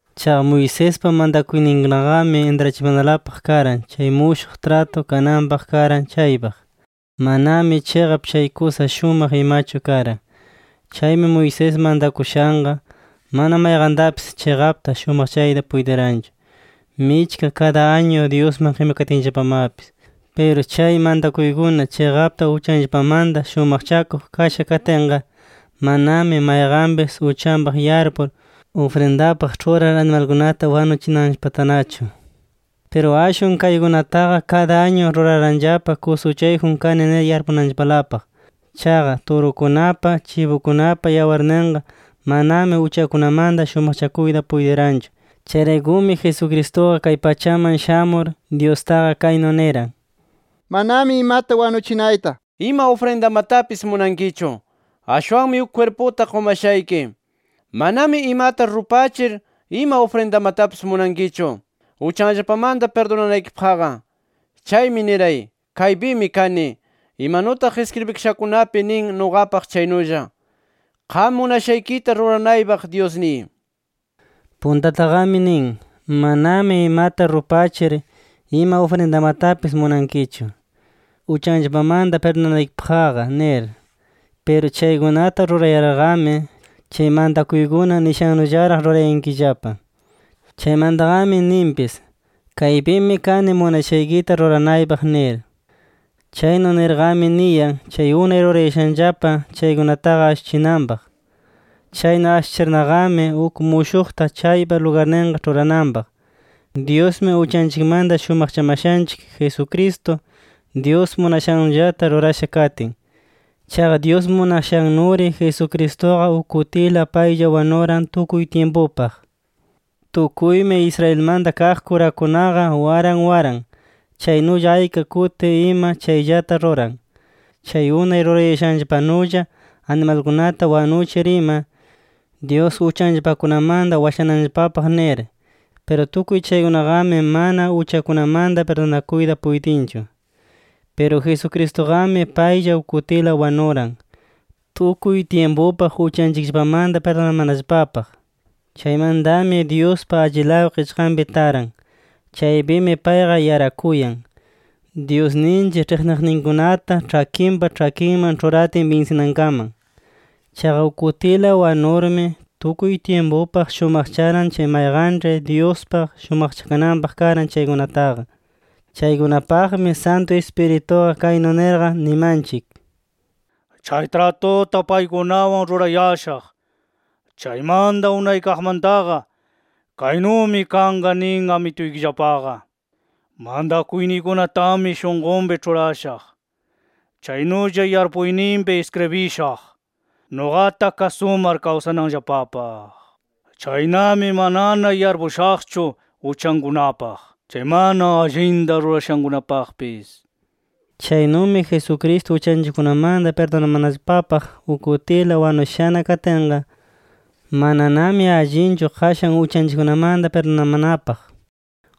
Chaqa Moisespa mantakuyninkunaqami, intrachimanalapaq karan chay mushuq tratu kananpaq karan chaypaq. Manami chiqap chay kusa shumaq imachu karan. Chaymi Moisés mantakushanqa, mana mayqantapis chiqapta shumaqchayta puytiranchu, michka kada añu Dyusman qimikatinllapamapis. Piru chay mantakuykuna chiqapta uchanllapamanta shumaqchakuq kasha katinqa, manami mayqanpis uchanpaq yarpur, ufrindapaq ĉhurar animalkunata wanuchinanllapatanachu. Piru ashwan kaykunataqa kada añu ruraranllapa, kusa uchayjun kani nir yarpunanllapalapaq. Chaqa turukunapa, chibukunapa yawarninqa, manami uchakunamanta shumaqchakuyta puytiranchu. Chayraykumi Jesucristuqa, kay pachaman shamur Dyustaqa kaynu niran: “Manami imata wanuchinayta, ima ufrindamatapis munankichu. Ashwanmi uk kwirputa qumashayki. Manami imata rupachir, ima ufrindamatapis munankichu uchanllapamanta pirdunanaykipaqqa. Chaymi niray: ‘Kaypimi kani, imanutaq iskribikashakunapi nin nuqapaq chaynulla. Qam munashaykita ruranaypaq Dyusniy’”. Puntataqami nin: “Manami imata rupachir, ima ufrindamatapis munankichu uchanllapamanta pirdunanaykipaqqa” nir. Piru chaykunata rurayarqami, chay mantakuykuna nishannullaraq rurayankillapa. Chaymantaqami ninpis: “Kaypimi kani munashaykita ruranaypaq” nir. Chaynu nirqami niyan, chay unay rurayashanllapa chaykunataqa ashuchinanpaq. Chaynu ashuchirnaqami, uk mushuqta chaypa lugarninqa ĉhurananpaq. Dyusmi uchanchikmanta shumaqchamashanchik, Jesucristo, Dyus munashannullata rurasha katin. Chaqa Dyus munashannuri Jesucristuqa uk kutila paylla wanuran tukuy tyimpupaq. Tukuymi Israelmanta kaq kurakunaqa, waran waran, chaynulla ayka kuti ima chayllata ruran, chay unay rurayashanllapanulla animalkunata wanuchir ima, Dyus uchanllapakunamanta washananllapapaq nir. Piru tukuy chaykunaqami mana uchakunamanta pirdunakuyta puytinchu. Piru Jesucristuqami paylla uk kutila wanuran, tukuy tyimpupaq uchanchikllapamanta pirdunamanallapapaq. Chaymantami Dyuspa allilaw qichqanpi taran. Chaypimi payqa yarakuyan, Dyusninchik ĉhiqniqninkunata ĉhakinpa ĉhakinman ĉhuratin binsinankaman. Chaqa uk kutila wanurmi, tukuy tyimpupaq shumaqcharan chay mayqanĉhi Dyuspaq shumaqchakananpaq karan chaykunataqa. Chaykunapaqmi Santu Ispirituqa kaynu nirqa nimanchik: “Chay tratuta paykunawan rurayashaq chaymanta unaykaqmantaqa, kaynumi kanqa nin Amituykillapaqa: Mantakuyniykunatami shunqunpi ĉhurashaq. Chaynulla yarpuyninpi iskribishaq, nuqata kasumar kawsananllapapaq. Chaynami, manana yarpushaqchu uchankunapaq, chay mana allinta rurashankunapaqpis” nir. Chaynumi Jesucristo uchanchikkunamanta pirdunamanallapapaq uk kutila wanushana katinqa, mananami allinchu qashan uchanchikkunamanta pirdunamanapaq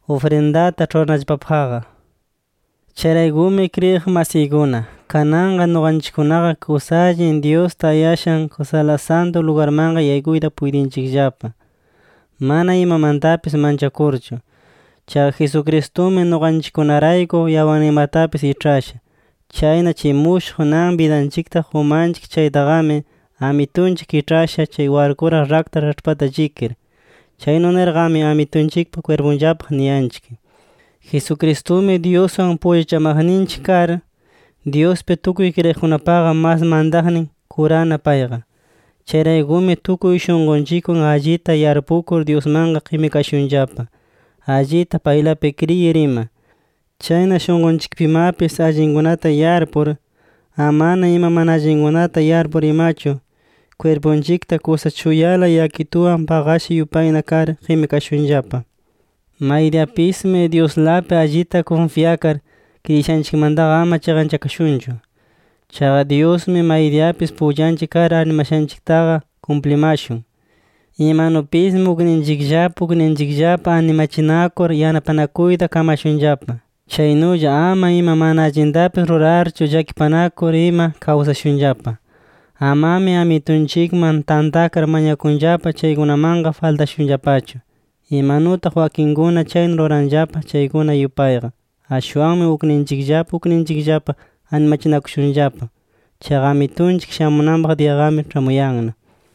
ufrindata ĉhuranallapapaqqa. Chayraykumi kriyiq masiykuna, kananqa nuqanchikkunaqa kusa allin Dyus tayashan Kusala Santu Lugarmanqa yaykuyta puytinchikllapa, mana imamantapis manchakurchu. Chaqa Jesucristumi nuqanchikkunarayku yawarninmatapis iĉhasha. Chayna chay mushuq nan bidanchikta qumanchik chaytaqami, Amitunchik kiĉhasha chay warkuraq rakta raĉhpata llikir. Chaynu nirqami Amitunchikpa kwirpunllapaq niyanchik. Jesucristumi Dyuswan pullachamaqninchik kar, Dyuspi tukuy kriyiqkunapaqa mas mantaqnin kurana payqa. Chayraykumi tukuy shunqunchikwan allita yarpukur Dyusmanqa qimikashunllapa, allita paylapi kriyir ima. Chayna shunqunchikpimapis allinkunata yarpur, amana ima mana allinkunata yarpur imachu, kwirpunchikta kusa chuyala yakituwan paqasha yupayna kar qimikashunllapa. Maydiyapismi Dyuslapi allita kunfyakar, kriyishanchikmantaqa ama chiqanchakashunchu. Chaqa Dyusmi maydiyapis pullanchik kar arnimashanchiktaqa kumplimashun. Imanupismi ukninchikllapa ukninchikllapa animachinakur yanapanakuyta kamashunllapa. Chaynulla ama ima mana allintapis rurarchu llakipanakur ima kawsashunllapa. Amami Amitunchikman tantakar mañakunllapa chaykunamanqa faltashunllapachu, imanutaq wakinkuna chaynu ruranllapa chaykuna yupayqa. Ashwanmi ukninchikllapa ukninchikllapa animachinakushunllapa. Chaqa Amitunchik shamunanpaq diyaqami ĉhamuyanna.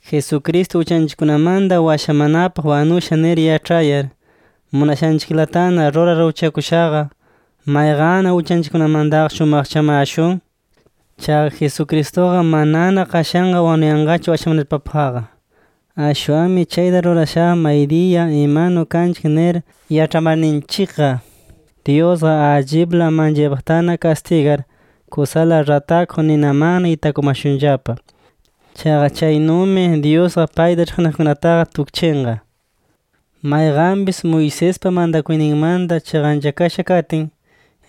Jesucristo uchanchikkunamanta washamanapaq wanusha nir yaĉhayar, munashanchiklatana rurar uchakushaqa, ¿mayqanna uchanchikkunamantaqa shumaqchamashun? Chaqa Jesucristuqa manana qashanqa wanuyanqachu washamanapaqqa. Ashwanmi chayta rurashaqa, maydiya imanu kanchik nir yaĉhamarninchikqa Dyusqa allipla manchaypaqtana kastigar, kusala ratakuq ninamanna itakumashunllapa. Chaqa chaynumi Dyusqa payta ĉhiqniqkunataqa tukchinqa. Mayqanpis Moisespa mantakuyninmanta chiqanchakasha katin,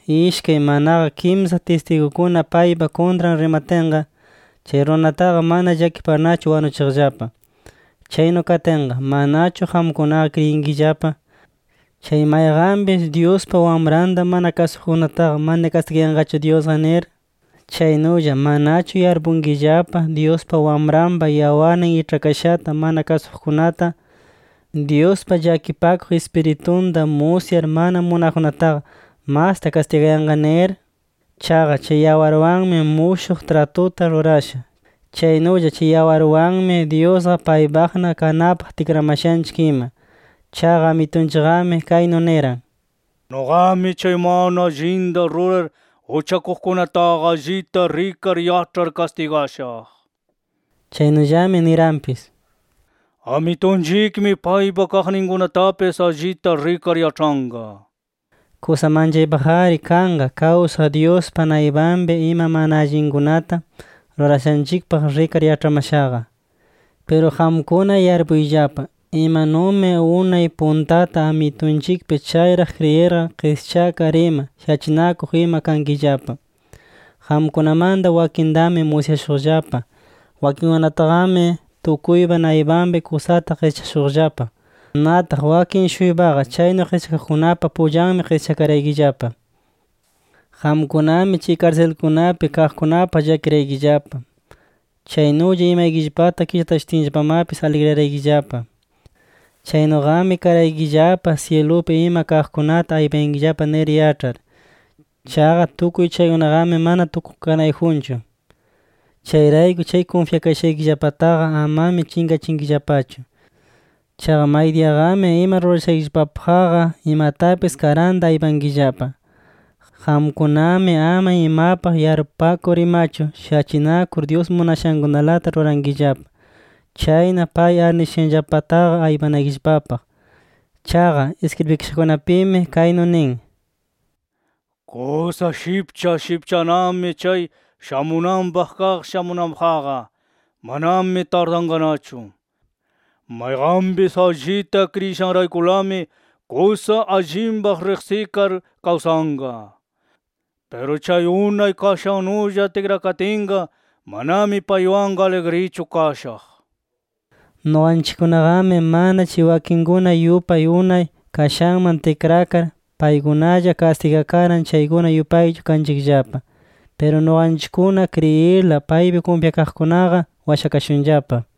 ishkay manaqa kimsa tistigukuna paypa kuntran rimatinqa, chay runataqa mana llakiparnachu wanuchiqllapa. Chaynu katinqa, ¿manachu qamkunaqa kriyinkillapa, chay mayqanpis Dyuspa Wamranta mana kasuqkunataqa mana kastigayanqachu Dyusqa nir? ¿Chaynulla manachu yarpunkillapa Dyuspa Wamranpa yawarnin iĉhakashata mana kasuqkunata, Dyuspa llakipakuq Ispiritunta musyar mana munaqkunataqa masta kastigayanqa nir? Chaqa chay yawarwanmi mushuq tratuta rurasha. Chaynulla chay yawarwanmi Dyusqa paypaqna kanapaq tikramashanchik ima. Chaqa Amitunchikqami kaynu niran: “Nuqami chay mana allinta rurar uchakuqkunataqa allita rikar yaĉhar kastigashaq”. Chaynullami niranpis: “Amitunchikmi paypa kaqninkunatapis allita rikar yaĉhanqa” nir. ¡Kusa manchaypaq-ari kanqa kawsaq Dyuspa naypanpi ima mana allinkunata rurashanchikpaq rikar yaĉhamashaqa! Piru qamkuna yarpuyllapa, imanumi unay puntata Amitunchikpi chayraq kriyirqa qischakar ima shachinakuq ima kankillapa. Qamkunamanta wakintami musyashuqllapa. Wakinkunataqami tukuypa naypanpi kusata qischashuqllapa. Nataq wakin-shuypaqa chaynu qischakaqkunapa pullanmi qischakaraykillapa. Qamkunami chay karsilkunapi kaqkunapaq llakiraykillapa. Chaynulla imaykillapata kitashutinllapamapis, aligriyaraykillapa. Chaynuqami karaykillapa syilupi ima kaqkunata aypayankillapa nir yaĉhar. Chaqa tukuy chaykunaqami mana tukukanayjunchu. Chayrayku chay kunfyakayashaykillapataqa amami chinqachinkillapachu. Chaqa maydiyaqami ima rurashaykillapapaqqa, imatapis karanta aypankillapa. Qamkunami ama imapaq yarpupakur imachu shachinakur, Dyus munashankunalata rurankillapa. Chayna pay arnishushanllapataqa aypanaykillapapaq. Chaqa iskribikashakunapimi kaynu nin: “Kusa shipcha shipchanami chay shamunanpaq kaq shamunanpaqqa. Manami tardanqanachu. Mayqanpis allita kriyishanraykulami, kusa allinpaq riqsikar kawsanqa. Piru chay unay kashannulla tikrakatinqa, manami paywanqa aligrichu kashaq” nir. Nuqanchikkunaqami, mana chay wakinkuna yupay unay kashanman tikrakar, paykunalla kastigakaran chaykuna yupaychu kanchikllapa. Piru nuqanchikkuna kriyirla paypi kunfyakaqkunaqa, washakashunllapa.